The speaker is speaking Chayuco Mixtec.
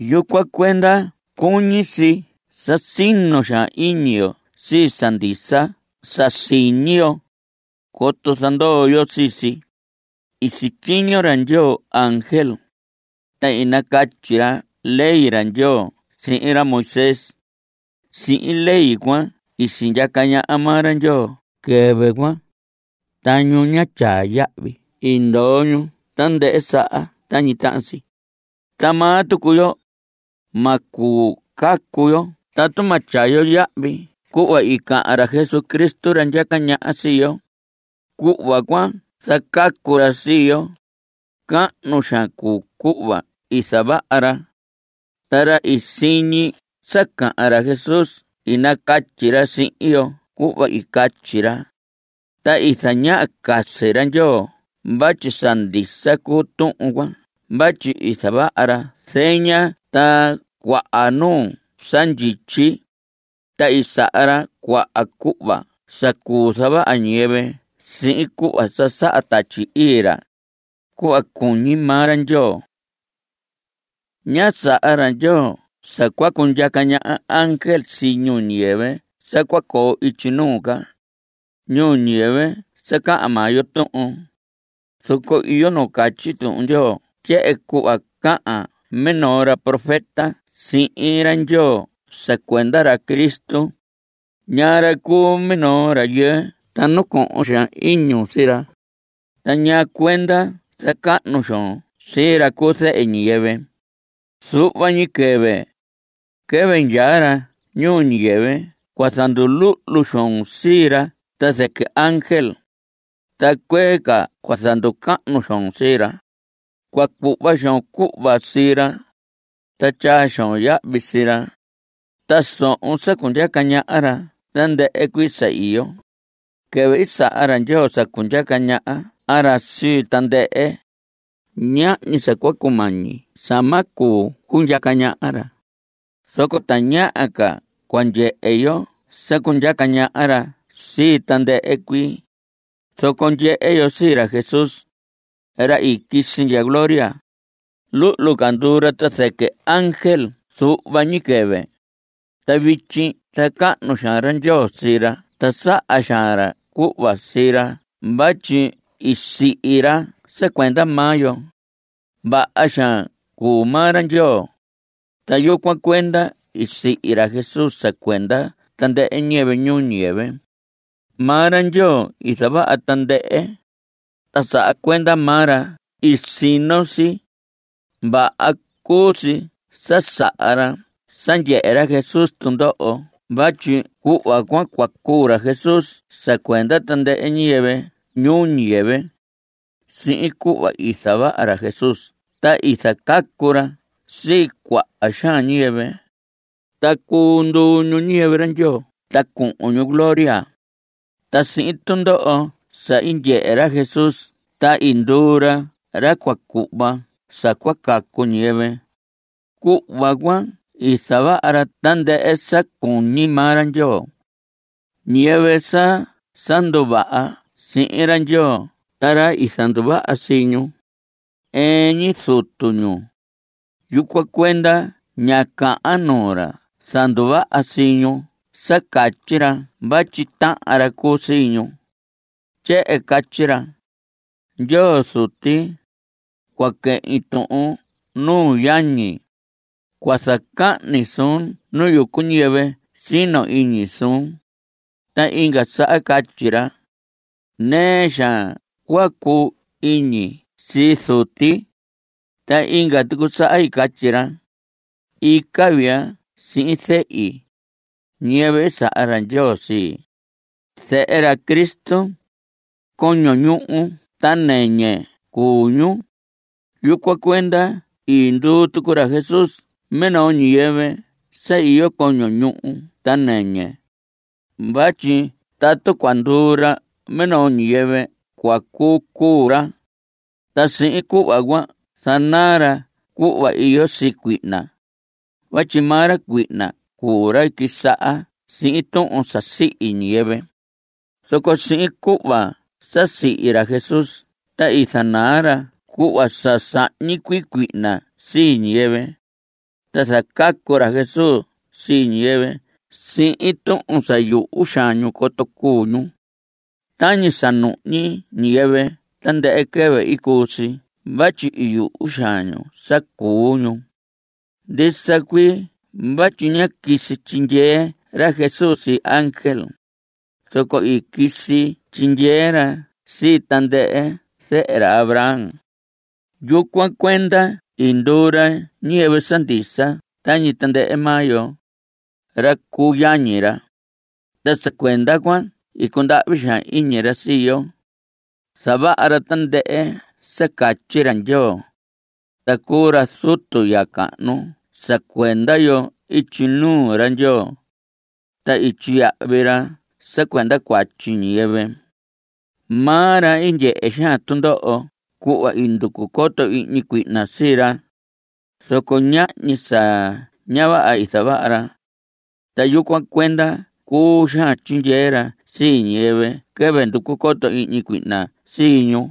Yucuan cuenda cuñi si sa sino xaan iñi yo sii sa ndisa sa siñi yo, coto zandoo yo sii si. I sityiño ra Ndyoo ángel, ta i nacatyi ra ley ra Ndyoo sihin ra Moisés. Sihin ley cuan i sindyaca ñaha maa ra Ndyoo quɨvɨ cuan, ta ñu ñá tyaa yahvi i ndoho ñu tandɨhɨ saha tañi tahan si. Ta maa tucu yo, ma cuu cacu yo tatu ma tyaa yo yahvi cuhva i cahan ra Jesucristo ra ndyaca ñaha sii yo, cuhva cua zacacu ra sii yo. Cahnu xaan cuu cuhva i zavaha ra. Ta ra i siñi sa cahan ra Jesús i nacatyi ra sihin yo cuhva i catyi ra. Ta i zañaha casi ra Ndyoo vatyi sa ndisa cuu tuhun cuan vatyi i zavaha ra zeña ta cuaha nuu sa ndyityi, ta i saha ra cuaha cuhva sa cuu zavaha ñiyɨvɨ sihin cuhva sa saha Tatyi Ii ra, cuhva cuñi maa ra Ndyoo. Ña saha ra Ndyoo sa cua cundyaca ñaha ángel sii ñuu ñiyɨvɨ sa cua coo ityi nuu ca, ñuu ñiyɨvɨ sa cahan maa yo tuhun. Zoco iyo nu catyi Tuhun Ndyoo tyehen cuhva cahan minoo ra profeta sihin ra Ndyoo sa cuenda ra Cristo: ¿Ñaa ra cuu minoo rayɨɨ ta nacohon xaan iñun sii ra, Ta ñaa cuenda zacahnu xoon sii ra cu zehe ñiyɨvɨ? Zuhva ni quɨvɨ, quɨvɨ ndyaa ra ñuu ñiyɨvɨ cua zanduluhlu xoon sii ra ta zɨquɨ ángel, Ta cuee ca cua zanducahnu xoon sii ra, Cua cuhva xoon cuhva sii ra, ta tyaa xoon yahvi sii ra; Ta sohon sa cundyaca ñaha ra tandɨhɨ cuii sa iyo. Quɨvɨ i saha ra Ndyoo sa cundyaca ñaha ra sii tandɨhɨ, ñahñi sa cua cumañi sa ma cuu cundyaca ñaha ra. Zoco tañaha ca cua ndyehe yo sa cundyaca ñaha ra sii tandɨhɨ cuii. Zoco ndyehe yo sii ra Jesús, ra i quisi ndya gloria. Luhlu ca i nduu ra ta zɨquɨ ángel zuhva ñi quɨvɨ. Ta vityi zacahnu xaan ra Ndyoo sii ra ta saha xaan ra cuhva sii ra vatyi i sihi ra sa cuenda maa yo. Vaha xaan cuu maa ra Ndyoo, ta yucuan cuenda i sihi ra Jesús sa cuenda tandɨhɨ ñiyɨvɨ ñuu ñiyɨvɨ. Maa ra Ndyoo i zavaha tandɨhɨ, ta sa cuenda maa ra i sino si. Vaha cuu si sa saha ra sa ndyehe ra Jesús tundoho vatyi cuhva cuan cua cuu ra Jesús sa cuenda tandɨhɨ ñiyɨvɨ ñuu ñiyɨvɨ. Sihin cuhva i zavaha ra Jesús ta i zacacu ra sii cuaha xaan ñiyɨvɨ, ta cuu nduu ñu ñiyɨvɨ ra Ndyoo ta cuhun ñu gloria. Ta sihin tundoho sa i ndyehe ra Jesús ta i nduu ra ra cua cuhva sa cua cacu ñiyɨvɨ. Cuhva cuan i zavaha ra tandɨhɨ sa cuñi maa ra Ndyoo. Ñiyɨvɨ sa sa nduvaha sihin ra Ndyoo ta ra i zanduvaha sii ñu, ɨɨn ñi Zutu ñu. Yucuan cuenda ña cahan nuu ra zanduvaha sii ñu sa catyi ra vatyi tahan ra cuu sii ñu. Tyehen catyi ra: Ndyoo Zuti, cua quehin tuhun nuu yañi, Cua zacahni suun nu yucu ñiyɨvɨ sino iñi suun. Ta inga saha i catyi ra: Nɨɨ xaan cua cuu iñi sii Zuti. Ta inga tucu saha i catyi ra: Ica vii ya sihin zehi, ñiyɨvɨ i saha ra Ndyoo sii. Zehe ra Cristo, coño ñuhu ta nɨñɨ cuu ñu. Yucuan cuenda i nduu tucu ra Jesús minoo ñiyɨvɨ sa iyo coño ñuhu ta nɨñɨ. Vatyi tatu cua nduu ra minoo ñiyɨvɨ cua cuu cuu ra, ta sihin cuhva cuan zanaa ra cuhva iyo sii cuihna. Vatyi maa ra cuihna cuu ra i quisaha sihin tuhun sa sihi ñiyɨvɨ. Zoco sihin cuhva sa sihi ra Jesús ta i zanaa ra cuhva sa sahñi cuii cuihna sii ñiyɨvɨ, ta zacacu ra Jesús sii ñiyɨvɨ sihin tuhun sa yuhu xaan ñu coto cuu ñu. Tañi sa nuhñi ñiyɨvɨ tandɨhɨ quɨvɨ i cuu si vatyi i yuhu xaan ñu sa cuu ñu. Ndisa cuii vatyi ñá quisi tyindyee ra Jesús sii ángel. Zoco quisi tyindyee ra sii tandɨhɨ zehe ra Abraham. Yucuan cuenda i nduu ra ñiyɨvɨ sa ndisa tañi tandɨhɨ maa yo, ra cu yañi ra. Ta sa cuenda cuan cundahvi xaan iñi ra sii yo. Zavaha ra tandɨhɨ sa catyi ra Ndyoo, ta cuu ra zutu ya cahnu sa cuenda yo ityi nuu ra Ndyoo. Ta i tyiyahvi ra sa cuenda cuatyi ñiyɨvɨ. Maa ra i ndyehe xaan tundoho cuhva i nducu coto ihñi cuihna sii ra, zoco ñahñi sa ña vaha i zavaha ra. Ta yucuan cuenda cuu xaan tyindyee ra sii ñiyɨvɨ quɨvɨ nducu coto ihñi cuihna sii ñu.